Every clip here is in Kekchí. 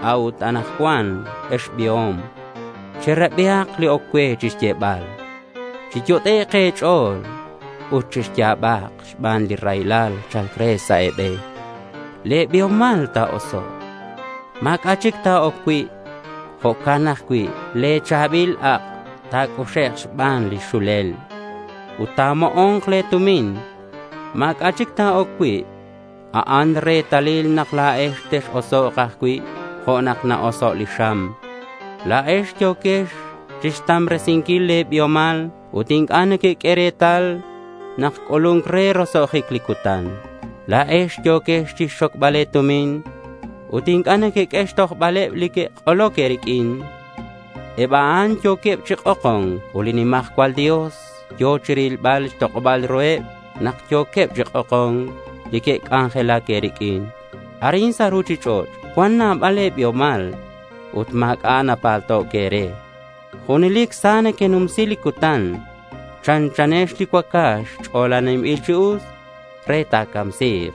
A'ut anakcuan, ex biom, cherabihak li oc cue chixyebal. Chiyot'ek' e̱ch'o̱l ut chexya̱bak xban li raylal cha̱lc re sa' e̱be̱n. Le̱ biomal ta̱osok'. Ma̱c'a' chic ta̱oc cui'. Jo'can ajcui' le̱ cha̱bil ak' ta̱c'uxek' xban li xulel. Ut ta̱mo'o̱nk le̱ tumin. Ma̱c'a' chic ta̱oc cui'. A'an retalil nak la̱ex tex-osok' ajcui' jo' nak na-oso' li xam. La̱ex yo̱quex chixtambresinquil le̱ biomal ut inc'a' nequeq'ue retal nak c'ulu̱nc re roso'jic li cutan. La̱ex yo̱quex chixxocbal e̱tumin ut inc'a' nequeq'ue xtojbaleb li que'k'oloc e̱riq'uin. Eb a'an yo̱queb chi k'oko̱nc ut li nimajcual Dios yo̱ chirilbal xtok'oba̱l ruheb nak yo̱queb chi k'oko̱nc li que'c'anjelac e̱riq'uin. Arin sa' ruchich'och' cuan nabal le̱ biomal ut ma̱c'a' napalto' e̱re. Junelic sa nequenumsi li cutan. Chanchanex li cuacax ch'olaninbil chi us re ta̱camsi̱k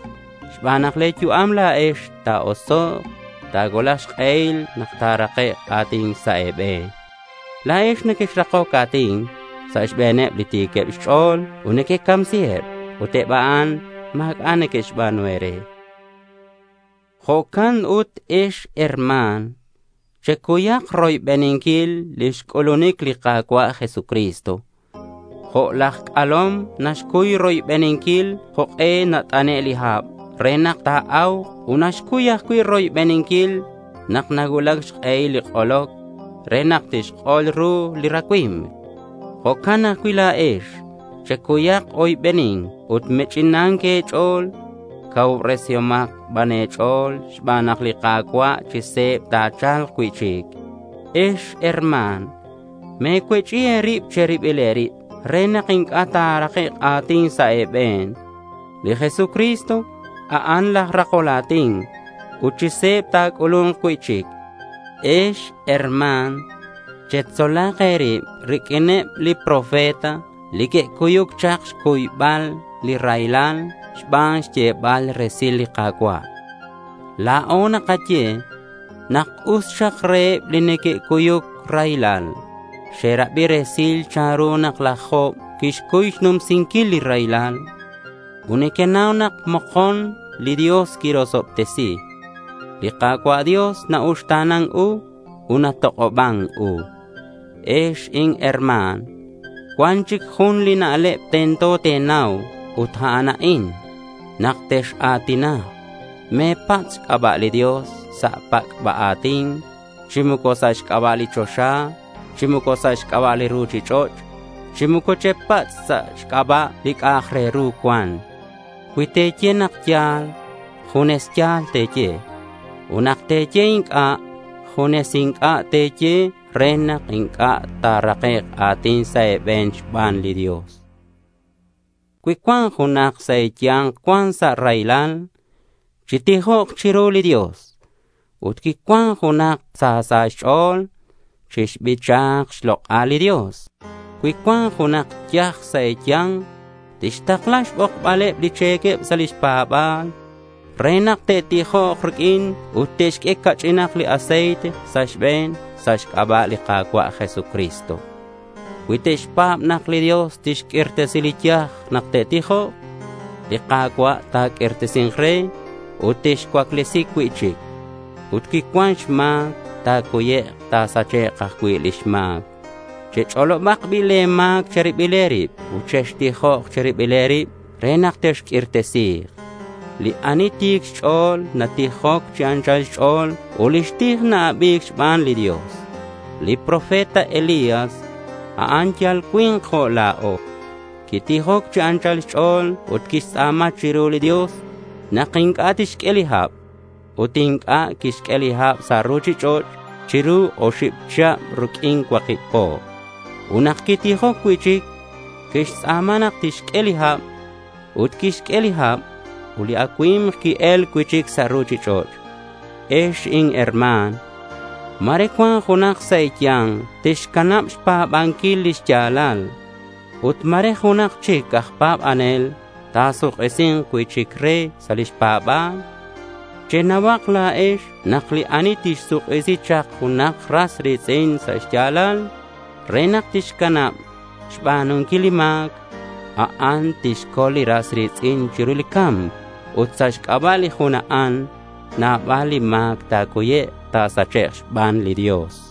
xban nak le̱ yu'am la̱ex, ta̱osok'. Ta̱cuulak xk'ehil nak ta̱rakek' a̱tin sa' e̱be̱n. La̱ex quexrakoc a̱tin sa' xbe̱neb li ti̱queb xch'o̱l ut quecamsiheb. Ut eb a'an ma̱c'a' que'xba̱nu e̱re. Jo'can ut ex herma̱n, checuyak roybeninquil lix c'ulunic li Ka̱cua' Jesucristo. Jo' laj c'alom naxcuy roybeninquil jok'e nat'ane' li hab re nak ta̱a̱uk ut naxcuy ajcui' roybeninquil nak nacuulac xk'ehil li k'oloc re nak tixk'ol ru li racui̱mk. Jo'can ajcui' la̱ex checuyak oybeni̱nc ut me̱ch'inan e̱ch'o̱l. Cacuubresihomak ban e̱ch'o̱l xban nak li Ka̱cua' chi se̱b ta̱cha̱lk cui'chic. Ex herma̱n, me̱cuech'i e̱rib che̱ribil e̱rib re nak inc'a' ta̱rakek' a̱tin sa' e̱be̱n. Li Jesucristo a'an laj rakol a̱tin ut chi se̱b ta̱c'ulu̱nk cui'chic. Ex herma̱n, chetzolak e̱rib riq'uineb li profeta li que'cuyuc chak xc'ulbal li raylal xban xyebal resil li Ka̱cua'. La̱o nakaye nak us xak reheb li neque'cuyuc raylal. Xerabi resil chanru nak laj Job quixcuy xnumsinquil li raylal. Ut nequenau nak mokon li Dios quirosobtesi. Li Ka̱cua' Dios na-uxta̱nan ut natok'oban u. Ex inherma̱n, cuan chic jun li na'leb tento te̱nau ut a'an a'in: nak tex-a̱tinak, me̱patz' xc'aba' li Dios sa' pac'ba a̱tin, chi moco sa' xc'aba' li choxa, chi moco sa' xc'aba' li ruchich'och', chi moco chepatz' sa' xc'aba' li c'a'ak re ru cuan. Cui te̱ye nak ya̱l, junes ya̱l te̱ye, ut nak te̱ye inc'a', junes inc'a' te̱ye re nak inc'a' ta̱rakek' a̱tin sa' e̱be̱n xban li Dios. Cui cuan junak sa' e̱ya̱nk cuan sa' raylal, chitijok chiru li Dios. Ut cui cuan junak sa sa' xch'o̱l, chixbicha xlok'al li Dios. Cui cuan junak yaj sa' e̱ya̱nk, tixtakla xbokbaleb li che̱queb sa' lix pa̱ba̱l, re nak te'tijok riq'uin ut te'xq'ue ca'ch'inak li aceite sa' xbe̱n sa' xc'aba' li Ka̱cua' Jesucristo. Cui te'xpa̱b nak li Dios tixq'uirtesi li yaj nak te'tijok, li Ka̱cua' ta̱q'uirtesi̱nk re ut tixcuaclesi cui'chic. Ut cui cuan xma̱c, ta̱cuyek' ta̱sachek' ajcui' lix ma̱c. Chech'olobak bi' le̱ ma̱c che̱ribil e̱rib ut chextijok che̱ribil e̱rib re nak texq'uirtesi̱k. Li ani ti̱c xch'o̱l natijoc chi anchal xch'o̱l ut lix tij na-abi̱c xban li Dios. Li profeta Elías, a'an yal cui̱nk jo' la̱o. Quitijoc chi anchal xch'o̱l ut quixtz'a̱ma chiru li Dios nak inc'a' tixq'ue li hab. Ut inc'a' quixq'ue li hab sa' ruchich'och' chiru li oxib chihab riq'uin cuakib po. Ut nak quitijoc cui'chic, quixtz'a̱ma nak tixq'ue li hab. Ut quixq'ue li hab ut li acui̱mk qui-el cui'chic sa' ruchich'och'. Ex inherma̱n, ma̱re cuan junak sa' e̱ya̱nk tixcanab xpa̱banquil lix ya̱lal, ut ma̱re junak chic aj pa̱banel ta̱suk'isi̱nk cui'chic re sa' lix pa̱ba̱l. Chenauhak la̱ex nak li ani tixsuk'isi chak junak li ras ri̱tz'in sa' xya̱lal re nak tixcanab xba̱nunquil li ma̱c, a'an tixcol li ras ri̱tz'in chiru li ca̱mc. Ut sa' xc'aba' li jun a'an, nabal li ma̱c ta̱cuyek' ta̱sachek' xban li Dios.